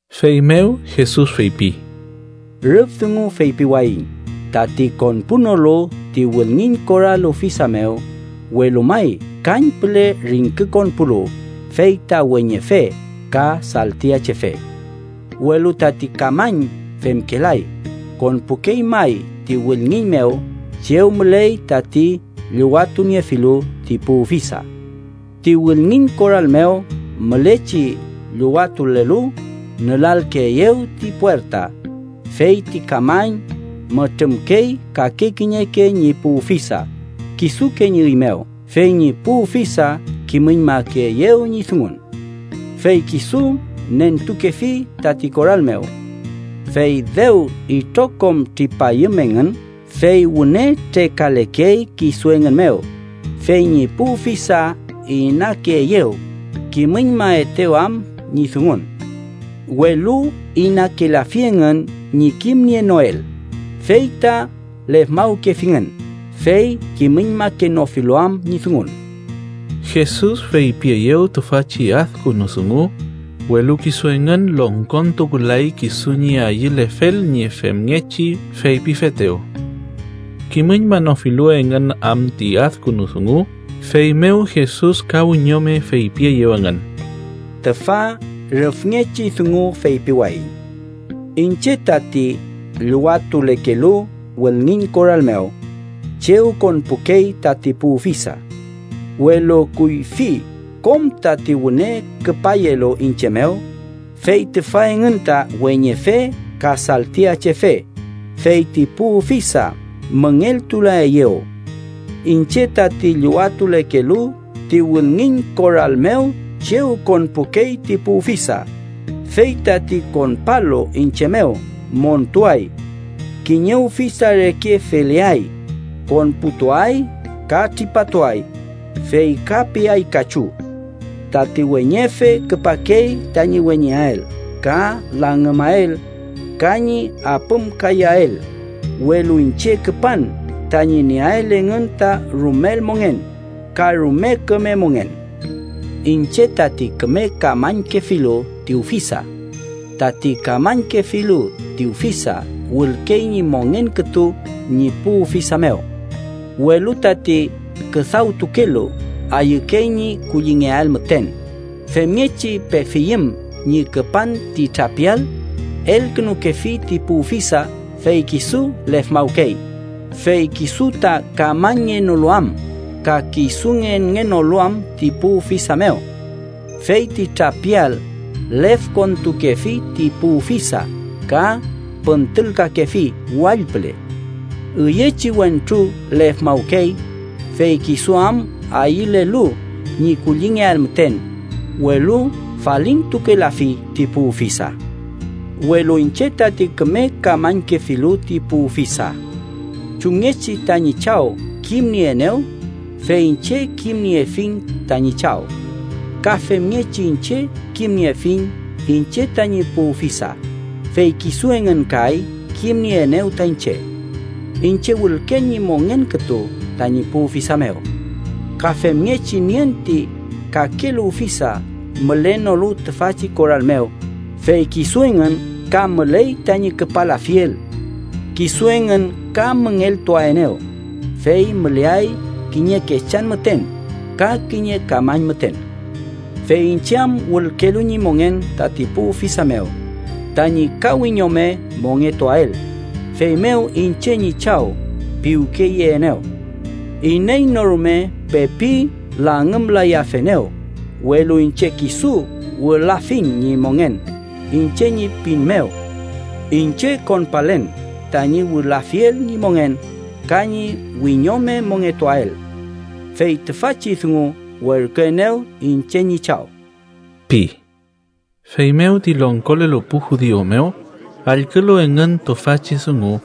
Feymew Jesus feypi: “Rüf dungu feypiwayiñ tati konpunolu ti wülngiñ koral ufisa mew, welu may kañpüle ringkükonpulu, fey ta weñefe ka saltiachefe. Welu tati kamañ femkelay, konpukey may ti wülngiñ mew chew müley tati llüwatuniefilu ti pu ufisa. Ti wülngiñ koral mew mülechi llüwatulelu nülalkeeyew ti puerta, fey ti kamañ mütrümkey kake kiñeke ñi pu ufisa kisuke ñi üy mew, fey ñi pu ufisa kimüñmakeeyew ñi dungun. Fey kisu nentukefi tati koral mew. Fey dew itrokom tripayüm engün, fey wüne trekalekey kisu engün mew, fey ñi pu ufisa inakeeyew kimüñmaetew am ñi dungun. Welu inakelafi engün ñi kimnienoel, fey ta lefmawkefingün, fey kimüñmakenofilu am ñi dungun.” Jesus feypieyew tüfachi adkünu dungu, welu kisu engün longkontukulay kisu ñi ayülefel ñi femngechi feypifetew. Kimüñmanofilu engün am ti adkünu dungu, feymew Jesus ka wiñome feypieyew engün: “Tüfa rüfngechi dungu feypiwayiñ: Iñche tati llüwatulekelu wülngiñ koral mew chew konpukey tati pu ufisa. Welu kuyfi kom tati wüne küpayelu iñche mew, fey tüfa engün ta weñefe ka saltiachefe, fey ti pu ufisa müngeltulaeyew. Iñche tati llüwatulekelu ti wülngiñ koral mew chew konpukey ti pu ufisa, fey tati konpalu iñche mew, montuay. Kiñe ufisa reke feleay. Konputuay ka tripatuay, fey ka peay kachu. Tati weñefe küpakey tañi weñeael ka langümael ka ñi apümkayael, welu iñche küpan tañi nieael engün ta rumel mongen, ka rume küme mongen. “Iñche tati küme kamañkefilu ti ufisa. Tati kamañkefilu ti ufisa wülkey ñi mongen kütu ñi pu ufisa mew. Welu tati küdawtukelu ayükey ñi kullingeael müten, femngechi pefiyüm ñi küpan ti trapial, elkünukefi ti pu ufisa fey kisu lefmawkey, fey kisu ta kamañngenolu am ka kisu ngenngenolu am ti pu ufisa mew. Fey ti trapial lefkontukefi ti pu ufisa ka püntülkakefi wall püle. Üyechi wentru lefmawkey, fey kisu am ayülelu ñi kullingeael müten, welu falintukelafi ti pu ufisa. “Welu iñche tati küme kamañkefilu ti pu ufisa. Chumngechi tañi Chaw kimnieenew, fey iñche kimniefiñ tañi Chaw, ka femngechi iñche kimniefiñ iñche tañi pu ufisa, fey kisu engün kay kimnieenew ta iñche. Iñche wülken ñi mongen kütu tañi pu ufisa mew. Ka femngechi nien ti kakelu ufisa mülenolu tüfachi koral mew, fey kisu engün ka müley tañi küpalafiel. Kisu engün ka müngeltuaenew, fey müleay kiñe kechan müten ka kiñe kamañ müten. “Fey iñche am wülkelu ñi mongen tati pu ufisa mew tañi ka wiñome mongetuael, feymew iñche ñi Chaw piwkeyeenew. Iney no rume pepi langümlayafenew, welu iñche kisu wülafiñ ñi mongen iñche ñi pin mew. Iñche konpalen tañi wülafiel ñi mongen ka ñi wiñome mongetuael. Fey tüfachi dungu werküenew iñche ñi Chaw” pi. Feymew ti longkolelu pu judiu mew allkülu engün tüfachi dungu,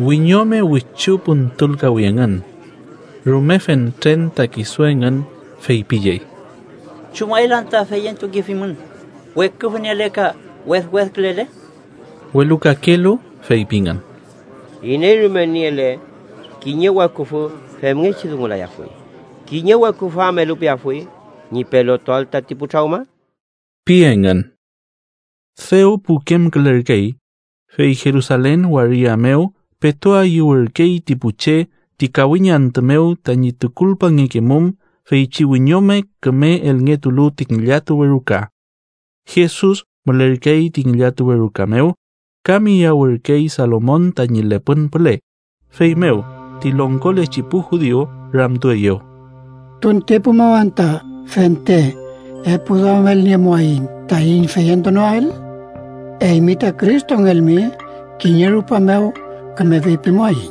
wiñome wichu püntülkawi engün. Rume fentren ta kisu engün feypiyey: —¿Chumael anta feyentukefimün, weküfü niele ka wedwedkülele? Welu kakelu feypingün: —Iney rume niele kiñe weküfü femngechi dungulayafuy. ¿Kiñe weküfü am elupeafuy ñi pelotuael tati pu trawma? ―pi engün. Dew pukemkülerkey, fey Jerusalen waria mew petu ayüwürkey ti pu che ti kawiñ antü mew tañi tukulpangekemum feychi wiñome küme elngetulu ti ngillatuwe ruka. Jesus mülerkey ti ngillatuwe ruka mew, ka miyawürkey Salomon tañi lepün püle. Feymew ti longkolechi pu judiu ramtueyew: —¿Tuntepu mew anta fente epuduamelniemuaiñ taiñ feyentunoael? Eymi ta Cristongelmi kiñe rupa mew küme feypimuaiñ.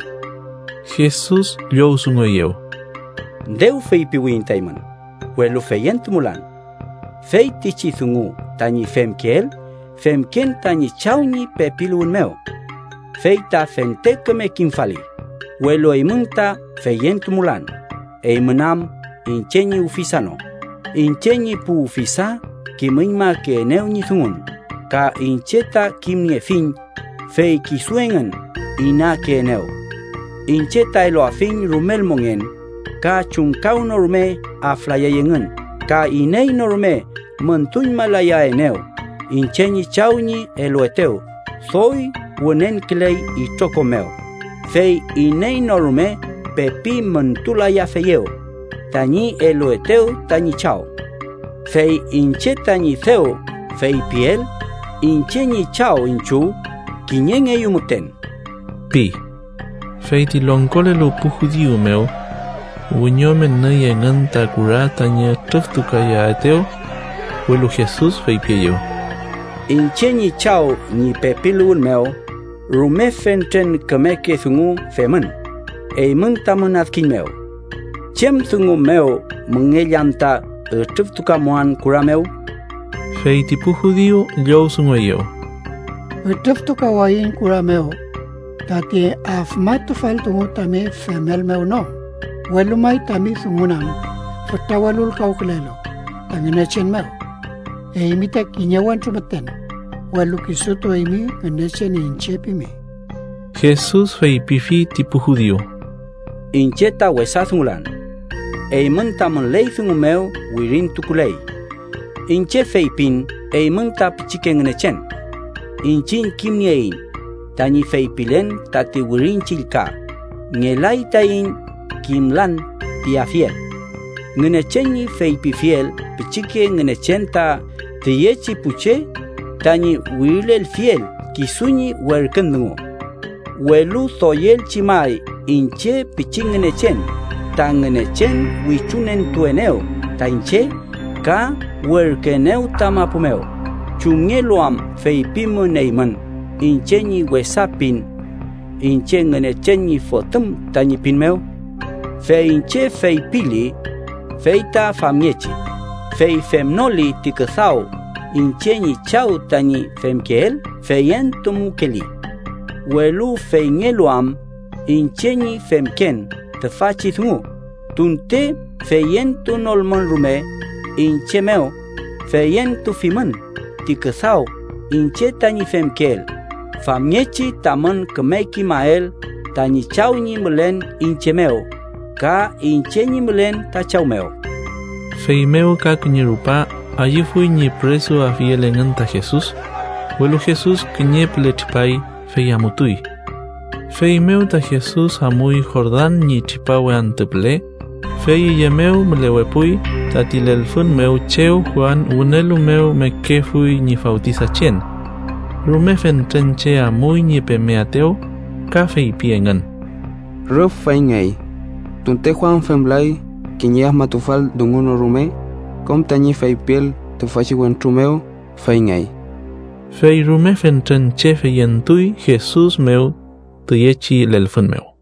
Jesus llowdungueyew: —Dew feypiwiyiñ ta eymün, welu feyentumulan. Feytichi dungu tañi femkeel, femken tañi Chaw ñi pepiluwün mew. Fey ta fente küme kimfali, welu eymün ta feyentumulan, eymün am iñche ñi ufisa no. Iñche ñi pu ufisa kimüñmakeenew ñi dungun, ka iñche ta kimniefiñ, fey kisu engün inakeenew. Iñche ta eluafiñ rumel mongen, ka chumkawnorume aflayay engün ka iney no rume müntuñmalayaenew. Iñche ñi Chaw ñi eluetew doy wünenküley itrokom mew, fey iney no rume pepi müntulayafeyew tañi eluetew tañi Chaw. Fey iñche tañi dew feypiel iñche ñi Chaw iñchiw kiñengeyu müten ―pi. Fey ti longkolelu pu judiu mew wiñome nüy engün ta kura tañi ütrüftukayaetew. Welu Jesus feypieyew: —Iñche ñi Chaw ñi pepiluwün mew rume fentren kümeke dungu femün eymün tamün adkiñ mew. ¿Chem dungu mew müngell anta ütrüftukamuan kura mew? Fey ti pu judiu llowdungueyew: —Ütrüftukawayiñ kura mew tati afmatufal dungu tami femel mew no, welu may tami dungun am fütra welulkawkülelu ta Ngünechen mew. Eymi ta kiñe wentru müten, welu kisutu eymi Ngünechen iñche pimi. Jesus feypifi ti pu judiu: —Iñche ta wesa dungulan. Eymün tamün ley dungu mew wirintukuley: ‘Iñche feypin eymün ta pichike ngünechen.’ Iñchiñ kimnieiñ tañi feypilen tati Wirin Chillka, ngelay taiñ kimlan piafiel: Ngünechen ñi feypifiel pichike ngünechen ta tüyechi pu che tañi wirilelfiel kisu ñi werkün dungu. Welu doyelchi may iñche pichi ngünechen ta Ngünechen wichuentuenew ta iñche ka werküenew ta mapu mew, ¿chumngelu am feypimün eymün iñche ñi wesa pin iñche Ngünechen ñi Fotüm tañi pin mew? Fey iñche feypili fey ta famngechi, fey femnoli ti küdaw iñche ñi Chaw tañi femkeel, feyentumukeeli. Welu feyngelu am iñche ñi femken tüfachi dungu, tunte feyentunolmün rume iñche mew, feyentufimün ti küdaw iñche tañi femkeel, famngechi tamün küme kimael tañi Chaw ñi mülen iñche mew ka iñche ñi mülen ta Chaw mew. Feymew ka kiñe rupa ayüfuy ñi püresuafiel engün ta Jesus, welu Jesus kiñe püle tripay, fey amutuy. Feymew ta Jesus amuy Jordan ñi tripawe antü püle, fey üye mew mülewepuy, tati lelfün mew chew Juan wünelu mew mekefuy ñi fawtisachen. Rume fentren che amuy ñi pemeaetew, ka feypi engün: —Rüf feyngey, tunte Juan femlay kiñe afmatufal dungu no rume, kom tañi feypiel tüfachi wentru mew feyngey. Fey rume fentren che feyentuy Jesus mew tüyechi lelfün mew.